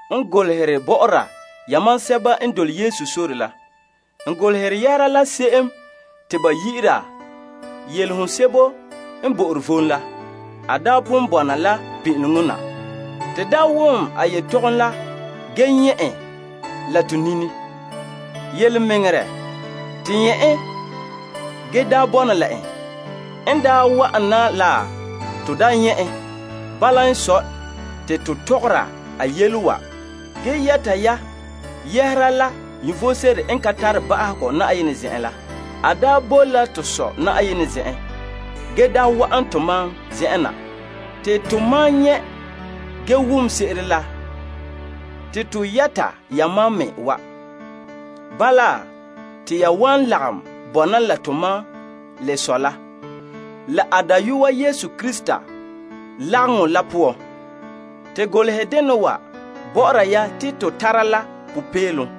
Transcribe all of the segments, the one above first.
To pa'alɛ bɔ'ɔra la yamam yɛhera la se'em te ba yi'ira Yelehom sebo n bo'ore vom la. A daa pon bɔna la pin'ileŋɔ na. To daa wom a yetɔgom la ge nyɛ' en la to nini. Yelemɛŋɛrɛ, te nyɛ' en, ge daa bɔna la en. N daa wa'an na la, to daa nyɛ' en. Bala n sɔe, te to tɔgɔra a yele wa ge yɛta ya yɛhera la vom sebo n ka tare ba'ahegɔ Na'ayenɛ zen'en la. A daa boe la to Sɔ' Na'ayenɛ zen'an la, ge daa wa'an tomam zen'en na la. Tomam nyɛ' ge wom se'ere la, te to yɛta yamam me wa. Bala, te ya wan lagom bɔna la tomam la Sɔ' la a Dayɔa Yesu Krista lagaŋɔ la poan. To golehɛ dena wa bɔ'ɔra ya te to tara la popeelom zo'e zo'e.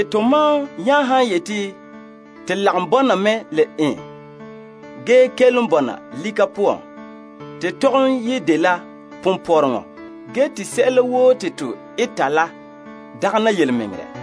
Tomam nya han yeti te lagom bɔna me la en, ge kelom bɔna lika poan, te tɔgom ye dela ponpɔrɔŋɔ ge te sɛla woo te to eta la dagɛna yelemɛŋɛrɛ.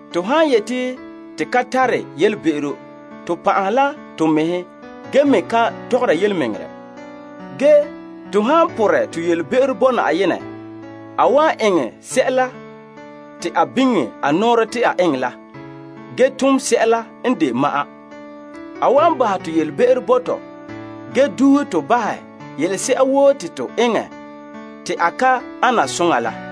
To han yeti to ka tare yelebe'ero, to pan'ahe la to mɛhe ge me ka tɔgɔra yelemɛŋɛrɛ. Ge to han porɛ to yelebe'ero bo Na'ayenɛ, a wan eŋɛ sɛla te a biŋe a nɔɔrɛ te a eŋɛ la, ge tom sɛla n de ma'an. A wan bahɛ to be'em bo to ge duuhe to bahɛ yelese'a woo te to eŋɛ te a ka ana soŋa la.